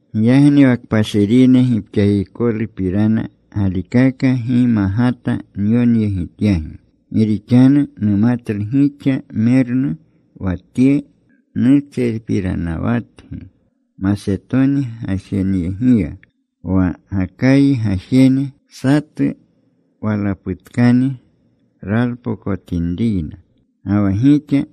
Giyagni wa kpashirine gipxakikolupirana galikaka gi magata nyonyegityagi. Gi rixanu numatlu gixa mernu. Wa tye nutserpiranawatgi Masetoni gajeneyegiya, wa Gakayi gajene satu walaputkani ralpokotinriyna. Ga wa gixa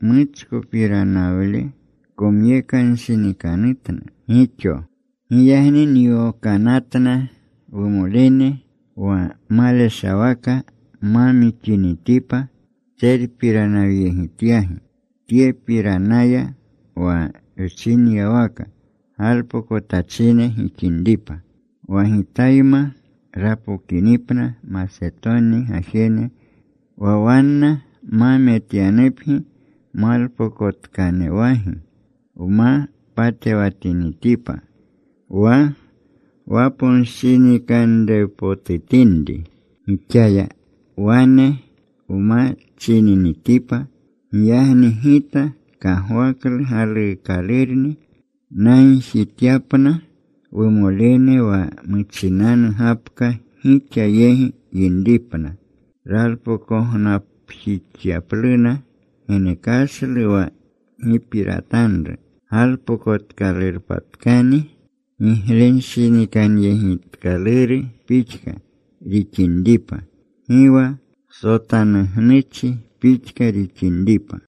muchkopiranawle komyekanshinikanutna gixo. Giyagni nyokanatna wumolene wa maleshawaka ma mixinitipa wtserpiranawyegityagi tyepiranaya, wa wchinyawaka galpokotachine gixinripa. Wa gitayma rapokinipna Masetoni gajene, wa wanna ma metyanupgi malpokotkanuwagi, wma patewatinitipa wa waponshinikanrewpotutinri, gixaya wane nma chininitipa. Giyagni gita kagwaklu galuukalurni nagjityapna wumolene wa muchinanu gapka gixa yegi yinripna ralpokognapjixyapluna genekashle wa gipiratanru, galpokotkalurpatkani giglenshinikanyegitkaluru pixka rixinripa, gi wa sotanugnuchi pixka rixinripa.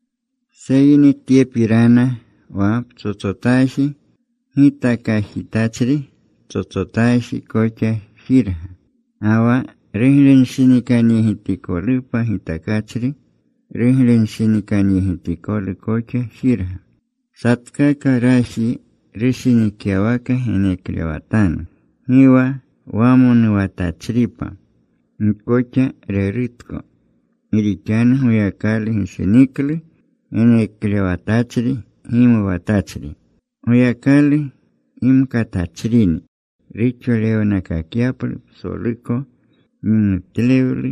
Seyni tyepirana. Wa ptsotsotaji gitakajitachri ptsotsotaji koxa jirga. Ga wa ruglenshinikanyegitikolupa gitakachri, ruglenshinikanyegitikolu koxa jirga. Satkaka raji rushinikyawaka geneklewatanu. Gi wa wamonuwatachripa. Gi koxa rerutko. Gi rixanu Goyakalu gishiniklu geneklewatachri gimuwatachri. Goyakalu gimkatachrini ruxolewnakakyaplu psoluko gimutlewlu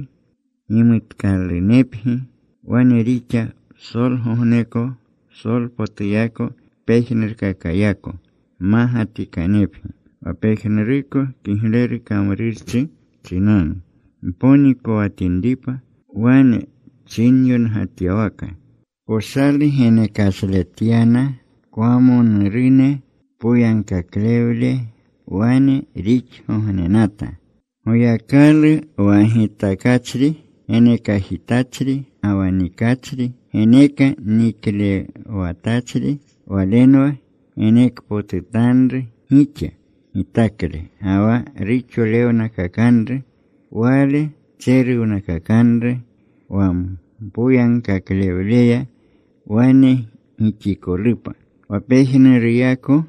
gimutkalunepgi. Wane rixa psolgogneko psolpotuyako pejnurkakayako mmagatikanepgi, wa pejnuruko kigleru kamrurchi chinanu mponikowatinripa. Wane chinyongatyawaka: Poshalu genekashletyana kwamonurune. Poyagkaklewle wane rixgognenata. Goyakalu, wa gitakachri genekajitachri, ga wa nikachri geneke niklerewatachri, Walenwa genekpotutanru gixa gitakle ga wa ruxolewnakakanru. Wale tseruwnakakanru wa mpoyagkaklewleya wane gixikolupa. Wa pejnuruyako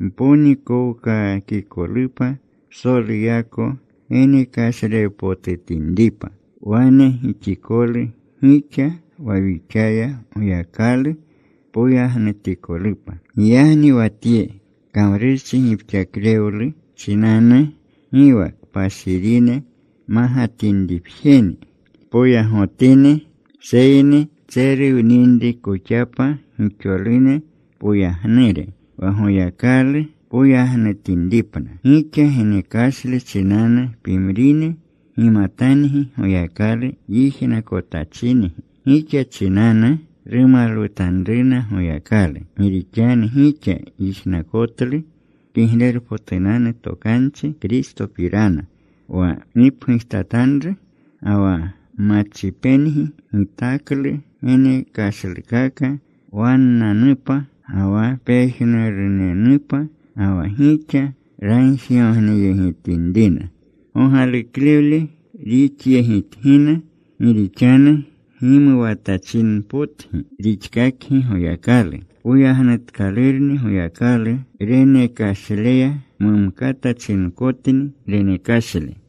mponikowkaakikolupa psoluyako genekashlewpotutinripa. Wane gixikolu gixa, wa wixaya Goyakalu poyagnutikolupa. Giyagni wa tye kamrurchi gipxaklewlu chinanu, gi wa kpashirine magatinripjeni poyagotini, seyni tseruwninrikoxapa gixolune poyagnure, wa Goyakalu poyagnutinripna. Gixa genekashle chinanu pimrine gimatangi Goyakalu yijnakotachingi. Gixa chinanu rumalwutanruna Goyakalu. Gi rixanu gixa yijnakotlu Kiglerpotunanu Tokanchi Kristopirana wa gipgujtatanru, ga wa machipengi gitaklu genekashlukaka wannanupa ga wa pejnurunenupa. Ga wa gixa ragjigogneyegitinrina gogaluklewlu rixyegitgina, gi rixanu gimuwatachinpotgi rixkakgi Goyakalu. Poyagnutkalurni Goyakalu renekashleya, mumkata chinkotni renekashle.